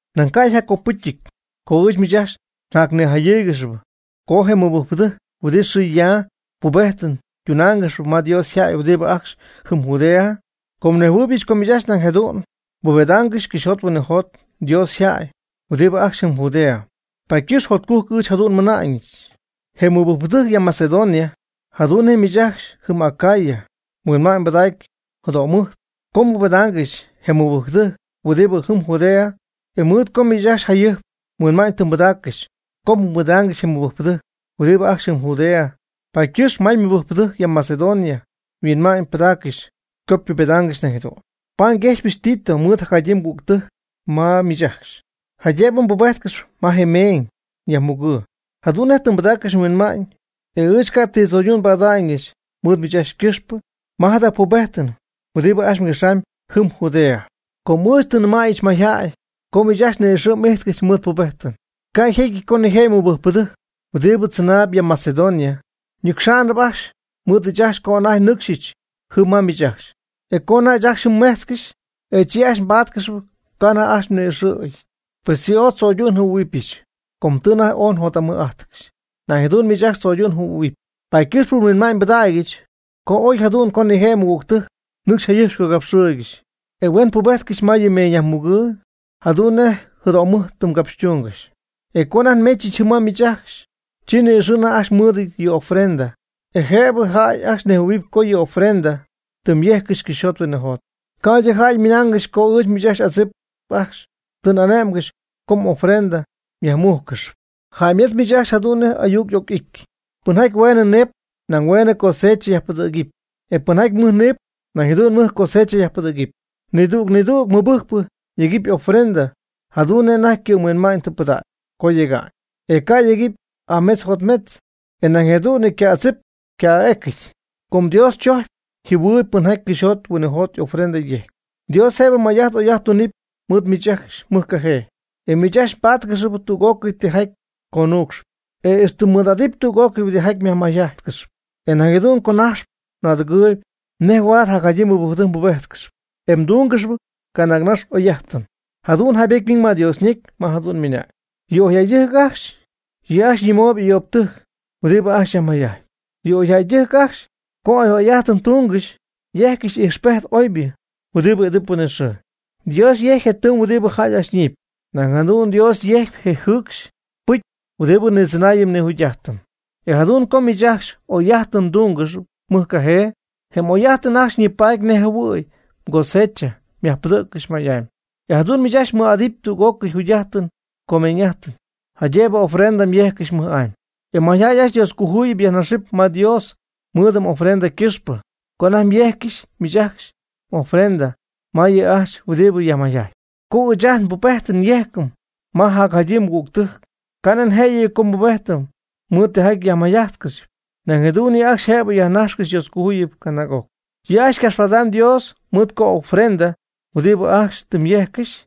Nañ ca' yjaty ycopɨcyɨty co ɨɨch miich ajcxy njacnijayɨ́ɨygɨxɨpy co je mɨbɨjcpɨdɨjc huɨdibɨ xɨɨ ya pubejtɨn tunaangɨxyp ma Dios yjäy huɨdibɨ ajcxy jɨm Judea. Com nejhuɨɨybɨch co miich ajcxy nañ jadu'n mbubedaangɨxy cɨxyjot huinɨjot Dios yjäy huɨdibɨ ajcxy jɨm Judea. Paady ycɨxp jotcujc ɨɨch jadu'n nnɨmäyɨch je mɨbɨjcpɨdɨjc ya Macedonia jadu'n nej miich ajcxy jɨm Acaya mhuinma'ñ pɨdacy jɨdöjɨmɨjt co mbubedaangɨxy je mɨbɨjcpɨdɨjc huɨdibɨ jɨm Judea. E mɨɨd co miich ajcxy jayɨjp mhuinma'ñ tɨ mbɨdaaccɨxy co mbubedaangɨxy je mɨbɨjcpɨdɨjc huɨdibɨ ajcxy jɨm Judea, paady ycɨxp may mɨbɨjcpɨdɨjc ya Macedonia yhuinma'ñ pɨdaaccɨxy co ypubedaangɨxy nañ jadu'n. Paady nguejxypɨch Tito mɨɨd jacjadyii mɨgügtɨjc ma miich ajcxy, jaydëbɨ xypubéjtcɨxɨpy ma je meeñ yajmugɨɨ, jadu'n nej tɨ mbɨdaaccɨxy huinma'ñ. E ɨɨch ca' ti tzo'ydu'n nbáadɨbɨch mɨɨd miich ajcxy ycɨxpɨ ma jada pubejtɨn huɨdibɨ ajcxy mguexamyb jɨm Judea. Com ɨɨch tɨ nnɨmäyɨch mayjäy co miich ajcxy ni'ixɨ' m'ijtcɨxy mɨɨd mbubejtɨn. Ca' yjecyɨty co nijëjɨty mɨbɨjcpɨdɨjc huɨdibɨ tzɨnaayb ya Macedonia ñɨcxa'nɨp ajcxy mɨɨd ɨɨch co anajty nnɨcxyɨch jɨm ma miich ajcxy. E co anajty ɨɨch ajcxy jɨm nmejtzcɨxy, e chi ajcxy nbáatcɨxɨpy ca' anajty ajcxy mni'ixɨ̈jɨty. Pues chi ooy tzo'ydu'n njɨhuɨ̈huɨbɨch, com tɨ anajty ooy njot'amɨj'ájtɨgɨxy. Nañ jadu'n miich ajcxy tzo'ydu'n mjɨhuɨ̈huɨp. Paady ycɨxp huinma'ñ nbɨdägyɨch co oy jadu'n co nijëjɨty mɨgügtɨjc nɨcxy jayɨjp xycogapxɨɨygɨxy, e huen xypubejtcɨxy ma yɨ meeñ yajmugɨɨ jadu'n nej jɨdöjɨmɨjt tɨ mgapxytungɨxy. E co anajty nmechɨch jɨm ma miich ajcxy, chi ni'ixɨ' anajty ajcxy mɨɨdɨty yɨ m'ofrenda, e jëbɨ jäy ajcxy nejhuɨ̈huɨp co yɨ m'ofrenda tɨ myejccɨxy cɨxyjot huinɨjot, ca'ydɨ jäy ymɨnaangɨxy co ɨɨch miich adzip ajcxy tɨ n'ane'mgɨxy co m'ofrenda nyajmújccɨxɨpy. Jäymetz miich ajcxy jadu'n nej ayuc y'oc'ity: Pɨnjaty huenɨ niip, nañ jadu'n hueenɨ ycosecha yajpɨdɨ̈gy. E pɨnjaty mɨj niip, nañ jadu'n mɨj ycosecha yajpɨdɨ̈gy. Nidüg nidüg mɨbɨjcpɨ yegɨpy y'ofrenda jadu'n nej anajty cɨ'm yhuinma'ñ tɨ pɨdägy co yega'ñ. E ca' yegɨpy ametz jotmetz. E nañ jadu'n ni yca'adzip yca'a'écɨty. Com Dios chojcpy yjɨhuɨɨyb pɨnjaty cɨxyjot huinɨjot y'ofrenda yejcp. Dios jëbɨ may'ajt oy'ajt tunɨpy mɨɨd miich ajcxy mɨjcajee, e miich ajcxy mbáatcɨxɨpy tüg'ócɨy tijaty conuucxɨn, e ixtɨ mmɨɨd'adɨpy tüg'ócɨy huɨdibɨ myajmayjajtcɨxy, e nañ jadu'n conaxpɨ naadɨgɨ̈bɨ nej huaad jacjadyii mɨbɨjcpɨdɨjc mbubejtcɨxy, e mdúngɨxɨpy canaagnax oyjäy'ajtɨn. Jadu'n jaybety ymiñ ma Dios ñecy, ma jadu'n ymɨna'ñ: Yɨ oyjäydɨjc ajcxy, yɨ' ajcxy nimooyb ayoobɨtɨjc huɨdibɨ ajcxy yajmayjajtpy. Yɨ oyjäydɨjc ajcxy co oyjäy'ajtɨn tungɨxy, yejccɨxyp ijxpejt oybɨ huɨdibɨ y'idɨpy huinɨxɨɨ. Dios yejcpy je tɨɨm huɨdibɨ jäy ajcxy ñiipy, nañ jadu'n Dios yejcpy je jɨɨcxy pɨcy huɨdibɨ nidzɨnaayɨm nijugy'ajtɨm. E jadu'n co miich ajcxy oyjäy'ajtɨn mdungɨx mɨjcajee, je m'oyjäy'ajtɨn ajcxy ñipaadɨp nej jɨhuɨ̈y mgosecha myajpɨdɨ̈ccɨxy may'amy. E jadu'n miich ajcxy mɨɨd'adɨpy tüg'ócɨy jugy'ajtɨn comeeñ'ajtɨn, jaydëbɨ m'ofrenda myejccɨxy mɨj'amy. E mayjäy ajcxy Dioscojuyip yajnaxɨpy ma Dios mɨɨd je m'ofrenda ycɨxpɨ, co anajty nyecyɨch miich ajcxy m'ofrenda ma yɨ' ajcxy huɨdibɨ yajmayjajtp. Co ɨɨch ajt pubejtɨn nyejcɨm ma jacjadyii mɨgügtɨjc, canan jëyɨ co nbubejtɨm mɨɨd tijaty yajmayjajtcɨxyp. Nañ jadu'n yɨ' ajcxy jëbɨ yajnajxcɨxy Dioscojuyip canaag'oc. Yɨ' ajcxy capxpadamb Dios mɨɨd co je m'ofrenda huɨdibɨ ajcxy tɨ myejccɨxy,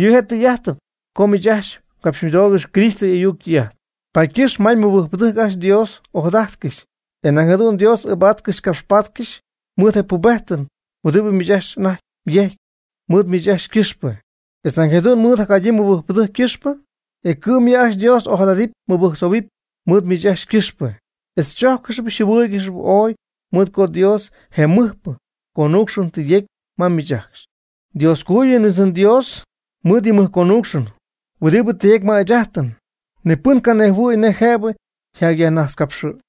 yɨ' je' tɨy'ajtɨp co miich ajcxy mgapxymɨdoogɨxy Cristo y'ayuc ytɨy'ajt. Paady ycɨxp may mɨbɨjcpɨdɨjc ajcxy Dios ojadájtcɨxɨpy e nañ jadu'n Dios ɨɨbáatcɨxɨpy capxpáatcɨxɨpy mɨɨd je pubejtɨn huɨdibɨ miich ajcxy anajty myejcpy mɨɨd yɨ' ajcxy ycɨxpɨ, etz nañ jadu'n mɨɨd jacjadyii mɨbɨjcpɨdɨjc ycɨxpɨ. E cɨ'm yɨ' ajcxy Dios ojadadɨpy mɨbɨjctzohuɨpy mɨɨd miich ajcxy ycɨxpɨ, etz xychójccɨxɨp xyjɨhuɨ́ɨygɨxɨp ooy mɨɨd co Dios je mɨjpɨ conuucxɨn tɨ yecy ma miich ajcxy. Dioscojuyip yɨ Huindzɨn'ajtɨm Dios mɨɨd yɨ ymɨjconuucxɨn huɨdibɨ tɨ yecy ma ɨɨch ajtɨn, ni pɨn canejhuɨ̈y nej jëbɨ yajnajtzcapxɨ̈y.